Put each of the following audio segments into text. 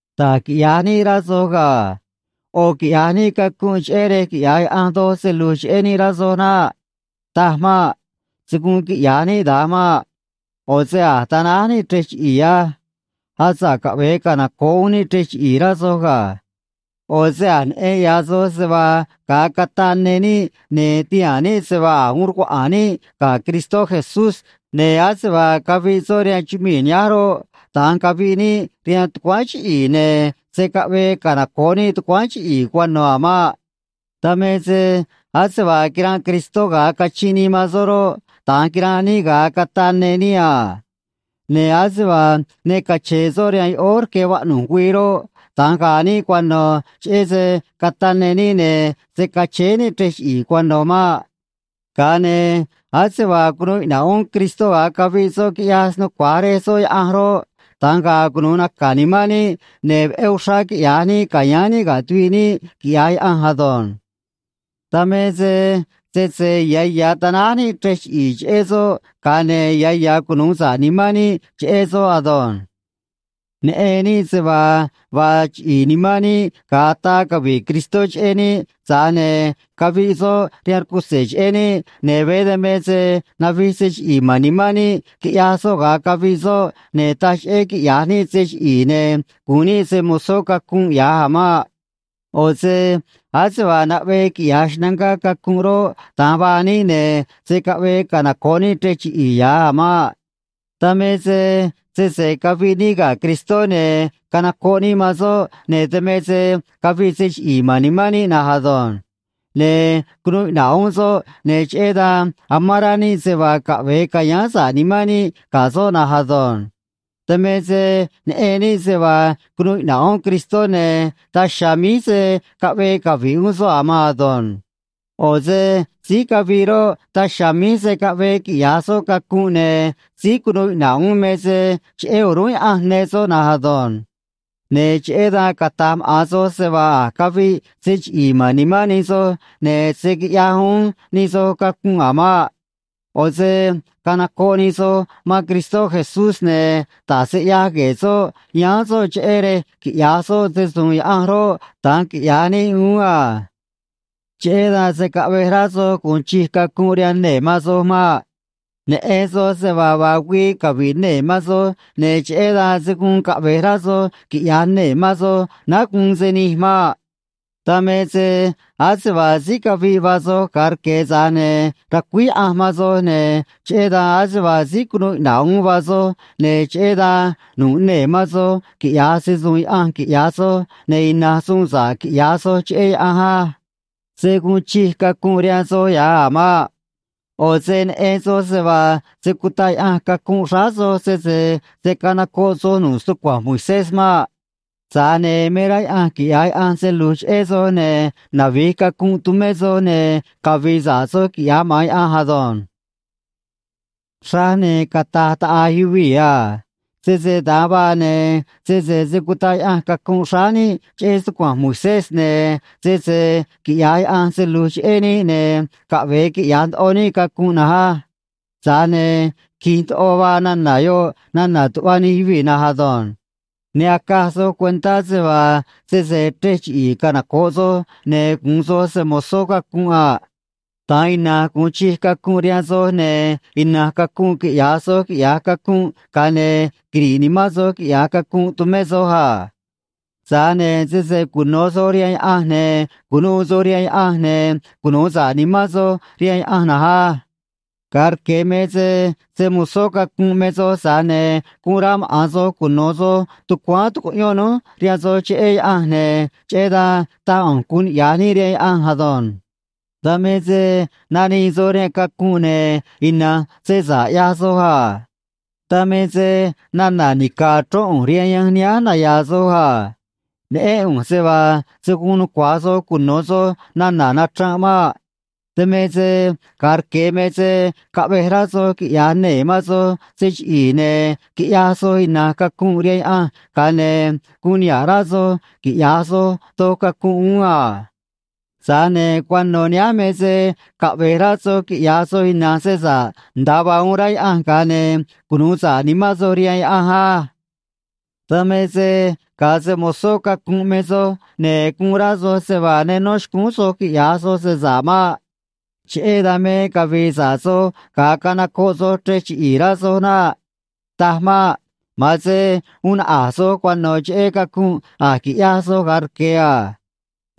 Da̱j quiꞌya̱j níꞌ, rá soj ga̱. ꞌO̱ quiꞌya̱j níꞌ cacunꞌ cheꞌé rej quiꞌya̱j Yaꞌanj doj se lu̱j cheꞌé níꞌ, rá soj naꞌ. Taj maꞌ. Se̱ guun quiꞌya̱j níꞌ da̱nj maꞌ. ꞌO̱ se a̱j tanáj níꞌ chrej chiꞌi̱i̱ á. Asa̱ꞌ caꞌve̱e canoco̱ꞌ uún níꞌ chrej chiꞌi̱i̱, rá soj ga̱. ꞌO̱ se a̱j neꞌen ya̱ soj se vaa ga̱a cataꞌ ne níꞌ ne̱ tihaa̱n níꞌ se vaa a̱j uun rcuaꞌa̱a̱n níꞌ ga̱ Cristó Jesús, ne̱ ase vaa caviꞌ soꞌ rihaan chumii̱ nihánj roꞌ, da̱nj caviꞌ níꞌ rihaan tucuáán chiꞌi̱i̱, ne̱ se̱ caꞌvee canoco̱ꞌ níꞌ tucuáán chiꞌi̱i̱ cuano̱ a̱ maꞌ. Dan me se ase vaa quiranꞌ Cristó ga̱a cachinꞌ nii man soꞌ roꞌ, da̱nj quiranꞌ níꞌ ga̱a cataꞌ ne níꞌ a. Ne̱ ase vaa ne cache̱e̱ soꞌ rihaan yoꞌóó rque vaꞌnu̱j güii roꞌ, da̱nj ga̱a̱ níꞌ cuano̱ cheꞌé se cataꞌ ne níꞌ, ne̱ se̱ cachéé níꞌ chrej chiꞌi̱i̱ cuano̱ maꞌ. Ga̱a ne̱ ase vaa cunuu iꞌna̱ꞌ uún Cristó ga̱a caviꞌ soꞌ, quiꞌyaj snucua̱j Rej soꞌ Yaꞌanj roꞌ, da̱nj ga̱a̱ cunu̱u naca̱ nimán níꞌ, ne̱ veꞌé uxrá quiꞌya̱j níꞌ ca̱yáán níꞌ ga̱ tuviꞌ níꞌ, quiꞌya̱j Yaꞌanj ado̱nj. Dan me se sese ya̱ ya̱ tanáj níꞌ chrej chiꞌi̱i̱ cheꞌé soꞌ, ga̱a ne̱ ya̱ ya̱ cunu̱u sa̱ꞌ nimán níꞌ cheꞌé soꞌ ado̱nj. Neꞌen níꞌ se vaa vaa chiꞌi̱i̱ nimán níꞌ ga̱a ataa cavi̱ꞌ Cristó cheꞌé níꞌ, tza̱j ne̱ caviꞌ soꞌ rihaan rcutze̱ cheꞌé níꞌ, ne̱ veé dan me se navij se chiꞌi̱i̱ ma̱n nimán níꞌ, quiꞌyaj soꞌ ga̱a caviꞌ soꞌ, ne̱ taj cheꞌé quiꞌya̱j níꞌ se chiꞌi̱i̱ ne̱ gu̱un níꞌ se‑mo̱zó cacunꞌ ya̱j a̱ maꞌ. ꞌO̱ se ase vaa naꞌvee quiꞌya̱j xnangá cacunꞌ roꞌ, da̱nj vaa níꞌ, ne̱ se̱ caꞌvee canoco̱ꞌ níꞌ chrej chiꞌi̱i̱ ya̱j a̱ maꞌ. Dan me se sese caviꞌ níꞌ ga̱ Cristó, ne̱ canocoꞌ níꞌ man soꞌ, ne̱ dan me se caviꞌ se chiꞌi̱i̱ ma̱n nimán níꞌ na̱nj ado̱nj. Ne̱ cunuu iꞌna̱ꞌ uún soꞌ, ne̱ cheꞌé dan amán rá níꞌ se vaa caꞌve̱e ca̱yáán sa̱ꞌ nimán níꞌ ga̱ soꞌ na̱nj ado̱nj. Dan me se neꞌen níꞌ se vaa cunuu iꞌna̱ꞌ uún Cristó, ne̱ daj chiha̱a̱ míj se̱ caꞌvee cavi̱ꞌ uún soꞌ a̱ maan ado̱nj. ꞌO̱ se síí caviꞌ roꞌ, daj chiha̱a̱ míj se̱ caꞌvee quiꞌya̱j soꞌ cacunꞌ, ne̱ síí cunuu iꞌna̱ꞌ uún me se cheꞌé o̱rúnꞌ Yaꞌanj ne soꞌ na̱nj ado̱nj. Ne̱ cheꞌé dan cata̱j maꞌa̱n soj se vaa a̱j caviꞌ se chiꞌi̱i̱ ma̱n nimán nij soj, ne̱ se̱ quiꞌyaj uún nij soj cacunꞌ a̱ maꞌ. ꞌO̱ se canacoꞌ nij soj man Cristó Jesús, ne̱ da̱j se ꞌyaj gue̱e̱ soꞌ, yáán soꞌ cheꞌé rej quiꞌya̱j soꞌ se‑su̱u̱n Yaꞌanj roꞌ, da̱nj quiꞌya̱j níꞌ uún a. Cheꞌé dan se̱ caꞌvej rá soj gu̱un chij cacunꞌ rihaan nee̱ man soj maꞌ. Neꞌen soj se vaa vaa güii cavi̱ꞌ nee̱ man soj, ne̱ cheꞌé dan se̱ guun caꞌve̱j rá soj quiꞌya̱j nee̱ man soj náá guun se nij maꞌ. Dan me se ase vaa síí caviꞌ vaa soj ga̱a rque̱, tza̱j ne̱ racuíj Yaꞌanj man soj, ne̱ cheꞌé dan ase vaa síí cunuu iꞌna̱ꞌ uún vaa soj, ne̱ cheꞌé dan nu̱ꞌ nee̱ man soj quiꞌya̱j se‑su̱u̱n Yaꞌanj, quiꞌya̱j soj, ne̱ ina̱nj suun sa̱ꞌ quiꞌya̱j soj cheꞌé Yaꞌanj á. Se̱ guun chij cacunꞌ rihaan soj ya̱j a̱ maꞌ. ꞌO̱ se neꞌen soj se vaa se̱ cutaꞌ Yaꞌanj cacunꞌ xráá soj sese se̱ canocoꞌ soj nu̱ꞌ stucua̱nj Moisés maꞌ. Tza̱j ne̱ me rá Yaꞌanj quiꞌya̱j Yaꞌanj se lu̱j cheꞌé soj, ne̱ navi̱j cacunꞌ tumé soj, ne̱ cavi̱i̱ sa̱ꞌ soj, quiꞌya̱j maꞌa̱n Yaꞌanj ado̱nj. Xraj ne̱ cata̱j taꞌa̱j yuvii̱ a: “Sese da̱nj vaa, ne̱ sese se̱ cutaꞌ Yaꞌanj cacunꞌ xráá níꞌ cheꞌé stucua̱nj Moisés, ne̱ sese quiꞌya̱j Yaꞌanj se lu̱j cheꞌé níꞌ, ne̱ caꞌve̱e quiꞌya̱j ndoꞌo níꞌ cacunꞌ na̱nj á.” Tza̱j ne̱ qui̱j ndoꞌo vaa nana̱ yoꞌ nana̱ tuꞌva nij yuvii̱ na̱nj ado̱nj. Ne acaj soj cuentá se vaa sese chrej chiꞌi̱i̱ canoco̱ꞌ soj, ne̱ gu̱un soj se‑mo̱zó cacunꞌ a. Da̱nj ina̱nj gu̱un chij cacunꞌ rihaan soj, ne̱ ina̱nj cacunꞌ quiꞌya̱j soj, quiꞌya̱j cacunꞌ, ga̱a ne̱ quiri̱ꞌ nimán soj, quiꞌya̱j cacunꞌ tumé soj a. Tza̱j ne̱ sese cuno̱ soj rihaan Yaꞌanj, ne̱ cu̱nuû soj rihaan Yaꞌanj, ne̱ cunu̱u sa̱ꞌ nimán soj rihaan Yaꞌanj na̱nj á. Ga̱a rque̱ me se se‑mo̱zó cacunꞌ me soj, tza̱j ne̱ guun rá maꞌa̱n soj cuno̱ soj tucuáán tucuꞌyón núj rihaan soj cheꞌé Yaꞌanj, ne̱ cheꞌé dan taj ꞌu̱nj guun niꞌya̱j níꞌ rihaan Yaꞌanj ado̱nj. Dan me se nanii soj rihaan cacunꞌ, ne̱ ina̱nj se sa̱ꞌ ꞌyaj soj a. (Dan me se nana̱ nica̱ achrón ꞌu̱nj rihaan yanj nihánj naya̱a̱ soj a. Neꞌén ꞌu̱nj se vaa se̱ guun nucua̱j soj cuno̱ soj nana̱ nachranꞌ maꞌ.) Dan me se ga̱a rque̱ me se caꞌvej rá soj quiꞌya̱j nee̱ man soj se chiꞌi̱i̱, ne̱ quiꞌyaj soj ina̱nj cacunꞌ rihaan Yaꞌanj, ga̱a ne̱ guun niha̱ꞌ rá soj quiꞌya̱j soj doj cacunꞌ uún a. Tza̱j ne̱ cuano̱ nihánj me se caꞌve̱j rá soj quiꞌya̱j soj ina̱nj se sa̱ꞌ nda̱a vaa uun rá Yaꞌanj, ga̱a ne̱ cunu̱u sa̱ꞌ nimán soj rihaan Yaꞌanj á. Dan me se ga̱a se‑mo̱zó cacunꞌ me soj, ne̱ guun rá soj se vaa ne nó xcúún soj quiꞌya̱j soj se sa̱ꞌ maꞌ. Cheꞌé dan me cavii sa̱ꞌ soj ga̱a canocoꞌ soj chrej chiꞌi̱i̱, rá soj naꞌ. Taj maꞌ. Ma̱an se uun naꞌa̱j soj cuano̱ cheꞌé cacunꞌ a̱j quiꞌyaj soj ga̱a rque̱ a.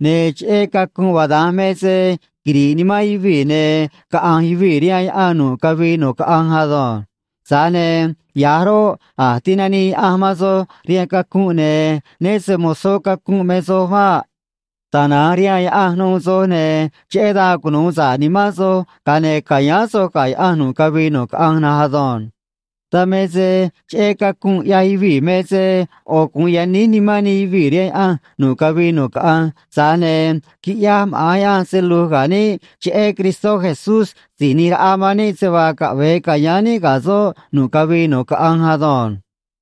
Ne̱ cheꞌé cacunꞌ vaa da̱nj me se quiri̱ꞌ nimán yuvii̱, ne̱ caꞌa̱nj yuvii̱ rihaan yaꞌan nu̱ꞌ cavii nu̱ꞌ caꞌanj ado̱nj. Tza̱j ne̱ ya̱j roꞌ, a̱j tinanii Yaꞌanj man soj rihaan cacunꞌ, ne̱ né se‑mo̱zó cacunꞌ me soj maꞌ. Tana̱nj rihaan Yaꞌanj nuû soj, ne̱ cheꞌé dan cunu̱u sa̱ꞌ nimán soj, ga̱a ne̱ ca̱yáán soj ga̱ Yaꞌanj nu̱ꞌ cavii nu̱ꞌ caꞌanj na̱nj ado̱nj. Dan me se cheꞌé cacunꞌ ꞌyaj yuvii̱ me se ꞌo̱ gu̱un yaníj nimán nij yuvii̱ rihaan Yaꞌanj nu̱ꞌ cavii nu̱ꞌ caꞌanj, tza̱j ne̱ quiꞌyaj maꞌa̱n Yaꞌanj se lu̱j ga̱ níꞌ cheꞌé Cristó Jesús Si̱j ꞌNi̱j Raꞌa man níꞌ se vaa caꞌve̱e ca̱yáán níꞌ ga̱ soꞌ nu̱ꞌ cavii nu̱ꞌ caꞌanj ado̱nj.